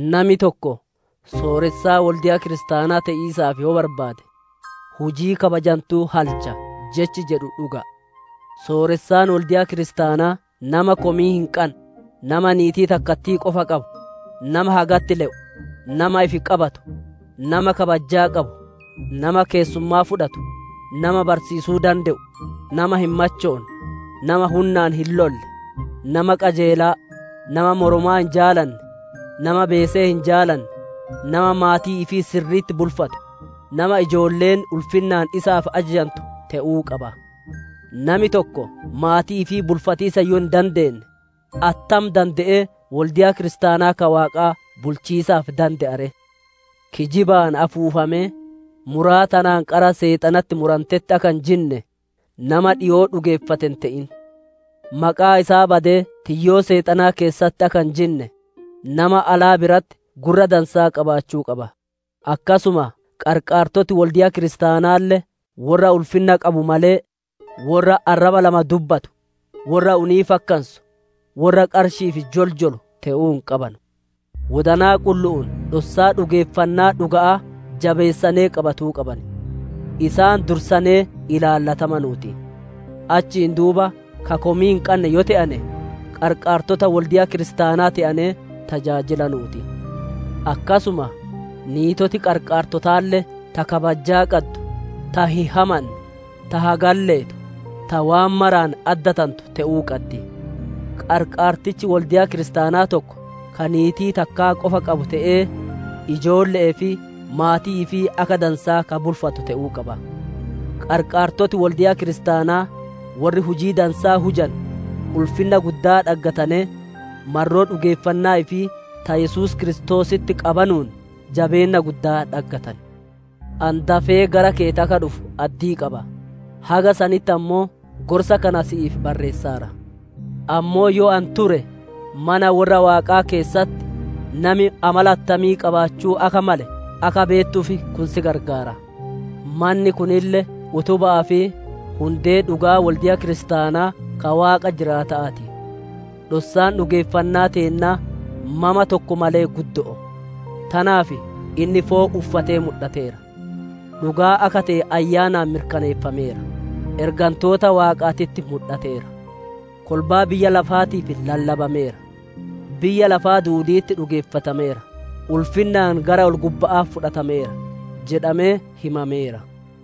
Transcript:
Nami tokko sooressaa Wolde'a kiristaanaa te'iisaaf yoo barbaade, hujii kabajantuu halcha jechi jedhu dhuga'a. Sooressaan wolde'a kiristaanaa nama komii hin qanne, nama niitii takkattii qofa qabu, nama hagatti le'u, nama ifi qabatu, nama kabajjaa qabu, nama keessummaa fudhatu, nama barsiisuu dande'u, nama hin machoonne, nama hunnaan hin lolle, nama qajeelaa, nama moromaa hin jaalanne, nama beesee hin jaalanne, nama maatii ifii sirri'itti bulfatu, nama ijoolleen ulfinnaan isaaf ajajantu te'uu qaba. Nami tokko maatii ifii bulfatiisa yoo hin dandeenne, attam dande'ee wolde'a kiristaanaa ka Waaqaa bulchiisaaf dande'a ree? Kijibaan afuufamee, muraa tanaan qara Seexanatti muranteetti akka hin jinne, nama dhikoo dhugeeffate hin te'in. Maqaa isaa badee tiyyoo Seexanaa keessatti akka hin jinne, nama alaa biratti gurra dansaa qabaachuu qaba. Akkasuma qarqaartoti wolde'a kiristaanaalle worra ulfinna qabu malee, worra arraba lama dubbatu, worra unii fakkansu, worra qarshi'iif joljolu te'uu hin qabanu; wodanaa qullu'uun dhossaa dhugeeffannaa dhuga'aa jabeessanee qabatuu qaban. Isaan dursanee ilaallatamanuu ti; achiin duuba ka komii hin qanne yoo te'ane qarqaartota wolde'a kiristaanaa te'anee tajaajilanuu ti. Akkasuma niitoti qarqaartotaalle ta kabajjaa qaddu, ta hin hamanne, ta hagatti leetu, ta waan maraan addatantu te'uu qaddi. Qarqaartichi wolde'a Kiristaanaa tokko ka niitii takkaa qofa qabu te'ee, ijoolle'ee fi maatii ifii akka dansaa ka bulfatu te'uu qaba. Qarqaartoti wolde'a kiristaanaa, worri hujii dansaa hujanu ulfinna guddaa dhaggatanee, marroo dhugeeffannaa ifii ta Yesuus Kiristoositti qabanuun jabeenna guddaa dhaggatan. Ani dafee gara keeti akka dhufu addii qaba, haga sanitti ammoo gorsa kana si'iif barreessaara. Ammoo yoo ani ture, mana worra Waaqaa keessatti nami amala attamii qabaachuu akka male akka beettuuf kun si gargaara; manni kunille utuba'aa fi hundee dhugaa wolde'a kiristaanaa ka Waaqa jiraata'aa ti. Dhossaan dhugeeffannaa teennaa mama tokko malee guddo'oo; tanaaf, «Inni foon uffatee mudhateera; dhugaa akka te'e Ayyaanaan mirkaneeffameera. Ergantoota Waaqaatitti mudhateera; kolbaa biyya lafaatiif lallabameera. Biyya lafaa duudi'itti dhugeeffatameera; ulfinnaan gara ol-gubba'aa fudhatameera» jedhamee himameera.